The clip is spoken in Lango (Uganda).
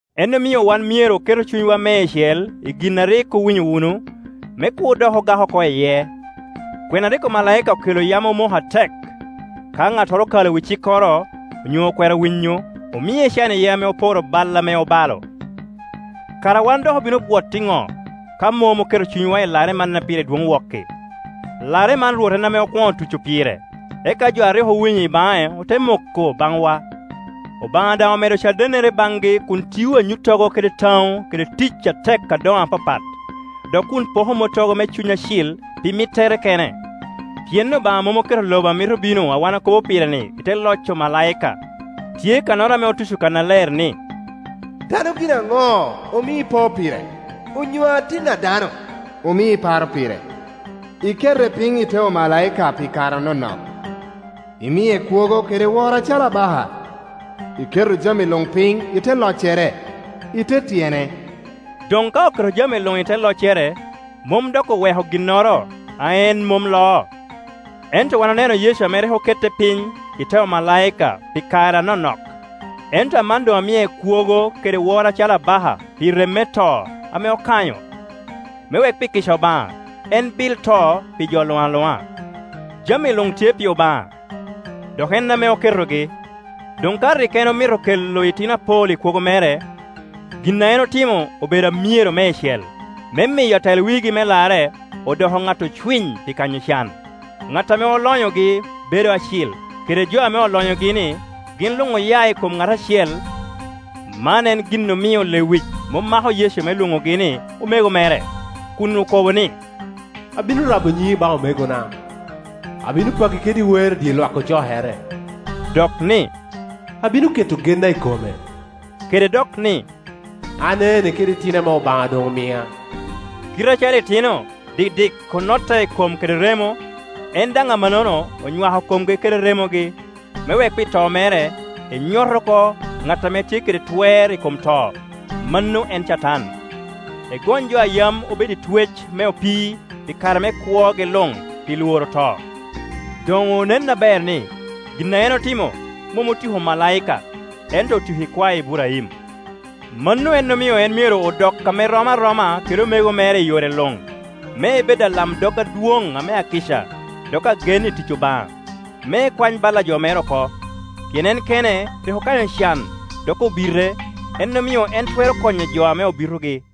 En omio wan myero oketu cunywa meicel i gin a rik owinyo wunu, me kur dok ogak oko iye. Kwena a rik omalaika okelo yam omoko atek. Ka ŋattoro okalo wi cikkoro onyo okwero winyo, omie can iye ame oporo bal ame obalo. Kara wan dok obino bwot iŋo ka mom oketo cunywa i larre man a pire dwoŋ wok-ki? Larre man Rwot en ame okwoŋo tuco pire, eka jo a rik owinyo i baŋe ote moko baŋwa. Obaŋa daŋ omedo cadennere baŋgi kun tio anyuttogo kede taŋo kede tic atek adoŋo apapat, dok kun poko mottogo me Cuny Acil pi mittere kene. Pien Obaŋa mom oketo lobo a mito bino a wan okobo pire-ni i te loc omalaika. Tye kannoro ame otuco kannaler ni, “Dano gin aŋo, omio ipo pire? Onyo atin a dano, omio iparo pire? Ikete piny i te omalaika pi kare anonok, imie kwogo kede woro acalo abaka, iketo jami luŋ piny i te loccere, i te tyene.” Doŋ ka oketo jami luŋ i te loccere, mom doŋ oweko ginnoro a en mom loo. Ento wan oneno Yecu ame rik okete piny i te omalaika pi kare anonok, ento aman doŋ amie kwogo kede woro acalo abaka pi rem me to ame okanyo, me wek pi kica Obaŋa en bil to pi jo luŋ aluŋa. Jami luŋ tye pi Obaŋa, dok en ame oketogi. Doŋ ka rik en omito kelo itino apol i kwogo mere, gin a en otimo obedo amyero meicel, me miyo atel wigi me larre odoko ŋat ocwiny pi kanyo can. Ŋat ame olonyogi bedo acil, kede jo ame olonyogi-ni, gin luŋ oya i kom ŋat acel; man en gin omio lewic mom mako Yecu me lwonogi ni omego mere, kun okobo ni, “Abino rabo nyiŋi baŋ omegona, abino paki kede wer i dye lwak ocokere.” Dok ni, “Abino keto genna i kome.” Kede dok ni, “An ene kede itino ame Obaŋa doŋ omia.” Kite acalo itino dikdik onotte i kom kede remo, en daŋ amannono onywako komgi kede remogi, me wek pi to mere enyot oko ŋat ame tye kede twer i kom to, mano en Catan, egony jo a yam obedo i twec me opii pi kare me kwogi luŋ pi lworo to. Doŋ onen aber ni, gin a en otimo mom otiko omalaika, ento otiko ikwae Iburaim. Mano en omio en myero odok ame erom aroma kede omego mere i yore luŋ, me ebed alamdog adwoŋ ame akica dok agen i tic Obaŋa, me ekwany bal a jo mere oko. Pien en kene rik okanyo can dok obite, en omio en twero konyo jo ame obitogi.